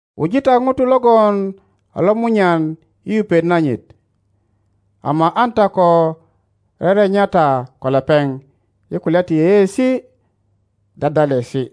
Wuji ta ŋuto logon a lomunyan i yupet nanyit, ama an ta ko rerenya ta ko lepeŋ i kulya ti yeyeesi dyadyalesi.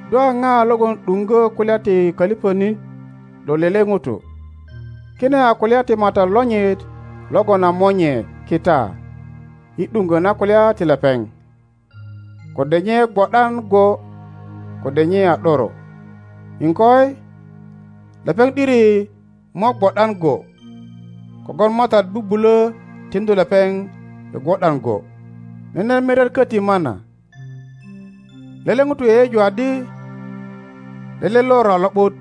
Do a ŋa logon ’duŋgö kulya ti köliŋönit lo lele ŋuto? Kine a kulya ti matat lonyit logon a monye kita i ’duŋgö na kulya ti lepeŋ, kode nye gwo ’dan go kode nye a ’doro. Iŋkoi, lepeŋ ’diri mo gwo ’dan go kogwon Matat bubulö tiŋdu lepeŋ i gwo ’dan go. Nene miret köti mana; lele ŋuto yeyeju adi lele lor a lo ’but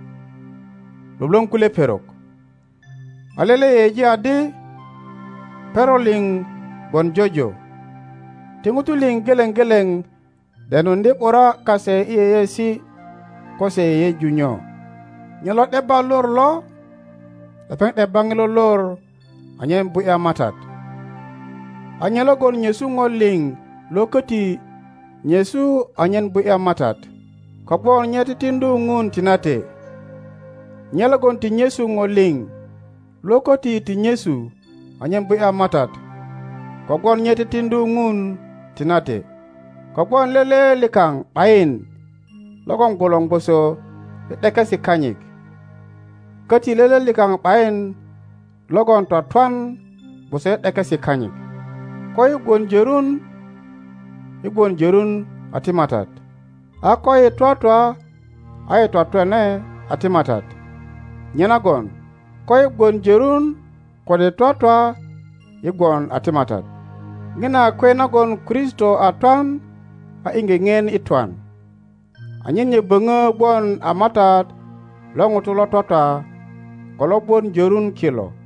lwölwöŋ kulye perok, a lele yeyeji adi perok liŋ gwon jojo. Ti ŋutu liŋ geleŋ geleŋ denuŋdye ’bura kase i yeyeesi ko se yeyeju nyo. Nye lo ’debba lor lo, lepeŋ ’debba ŋilo lor anyen bu ’ya Matat; a nye logon nyesu ŋo liŋ lo köti nyesu anyen bu ’ya Matat, kogwon nye titiŋdu Ŋun tinate. Nye logon ti nyesu ŋo liŋ lo köti ti nyesu anyen bu ’ya Matat, kogwon nye titiŋdu Ŋun tinate. Kogwon lele likaŋ ’bayin logon gwolor gwoso i ’dekesi kanyit, köti lele likaŋ ’bayin logon twatwan gwoso i ’dekesi kanyit. Koyi gwon jörun yi gwon jörun a ti Matat, a koyi twatwa a yi twatwane a ti Matat. Nyenagon koyi gwon jörun kode twatwa yi gwon a ti Matat. Ŋina a kwe nagon Kristo a twan a iŋge ŋien i twan, anyen nye böŋö gwon a Matat lo ŋutu lo twatwa ko lo gwon jörun kilo.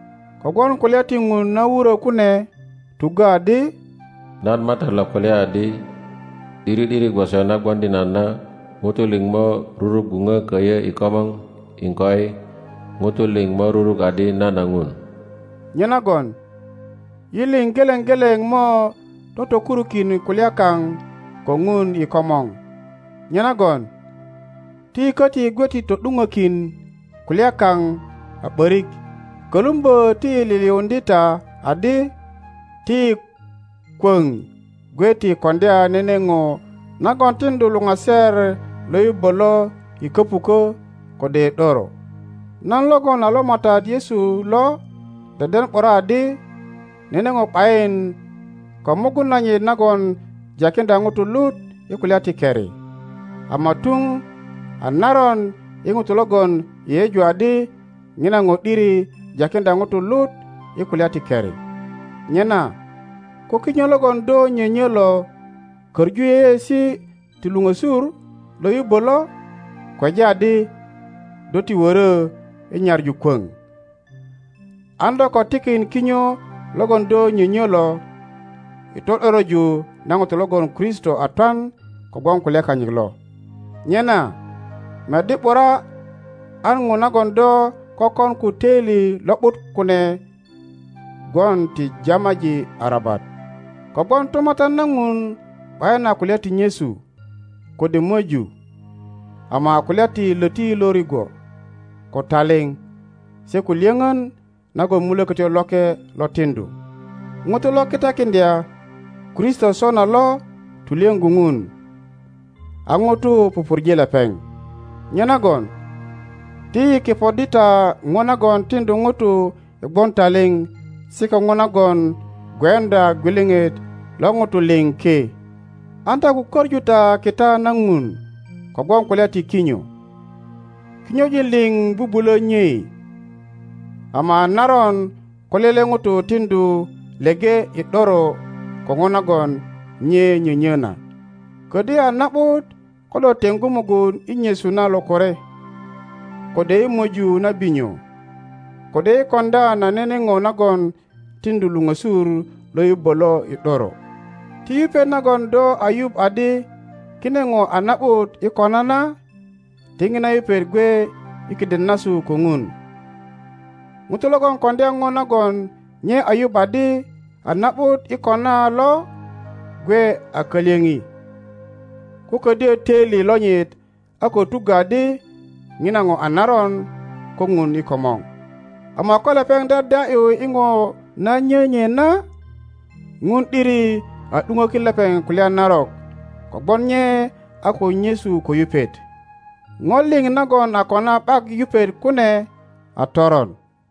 kogwon kulya ti Ŋun na wuro kune tuggö adi, Nan Matat lo kulya adi, ’Diri ’diri gwoso na gwoŋdi nan na, ŋutu liŋ mo rurugwuŋö köyö i komor, iŋkoi, ŋutu liŋ mo ruruk adi nan a Ŋun. Nyenagon yi liŋ geleŋ geleŋ mo totoleurukin kulya kaŋ ko Ŋun i komor. Nyenagon ti yi köti gwe ti to ’duŋökin kulya kaŋ a ’börik, kölumbö ti yi liliundye ta adi ti yi kwöŋ gwe ti kondya nene ŋo nagon tindu luŋaser lo yubbö lo i köpukö kode i ’doro. Nan logon a lo Matat Yesu lo deden ’bura adi nene ŋo ’bayin ko mugun nanyit nagon jakindya ŋutu lut i kulya ti keri, ama tuŋ a naron i ŋuto logon yeyeju adi ŋina ŋo ’diri jakindya ŋuto lut i kulya ti keri. Nyena ko kinyo logon do nyönyö lo köŋu yeyeesi ti luŋösur lo yubbö lo, kweja adi do ti wörö i nyaŋu kwöŋ. An do ko tikin kinyo logon do nyönyö lo i to ’doroju na ŋuto logon Kristo a twan kogwon kulya kanyit lo. Nyena meddi ’bura an ŋo nagon do kökon ko töili lo ’but kune gwon ti jamaji arabat. Kogwon tumatyan na Ŋun ’bayin a kulya ti nyesu kode möju, ama a kulya ti löti lo rigwo, ko taliŋ, se ko lyöŋön nagon Mulökötyo Loke lo tindu. Ŋuto lo kitakindya Kristo sona lo tulyöŋgu Ŋun, a ŋutu pupurje lepeŋ. Nyenagon ti yi kepoddi ta ŋo nagon tindu ŋutu i gwon taliŋ se ko ŋo nagon gweundya gwiliŋit lo ŋutu liŋ ki. An ta ko köŋu ta kita na Ŋun kogwon kulya ti kinyo. Kinyojin liŋ bubulö nyei, ama a naron ko lele ŋuto tindu leŋe i ’doro ko ŋo nagon nye nyönyö na. Ködyö a na ’but ko do teŋgu mugun i nyesu na lokore, kode i möju na binyo, kode i koŋdya na nene ŋo nagon tiŋdu luŋösur lo yubbö lo i ’doro. Ti yupet nagon do a yuŋ adi kine ŋo a na ’but i kona na, ti ŋina yupet gwe i kiden nasu ko Ŋun. Ŋuto logon koŋdya ŋo nagon nye a yuŋ adi a na ’but i kona lo gwe a kalyöŋi, ko ködyö töili lonyit a ko tuggö adi ŋina ŋo a naron ko Ŋun i komor. Ama ko lepeŋ dyadya ’yu i ŋo na nyö nye na, Ŋun ’diri a ’duŋökin lepeŋ kulya narok kogwon nye a ko nyesu ko yupet. Ŋo liŋ nagon a kona ’bak yupet kune a toron.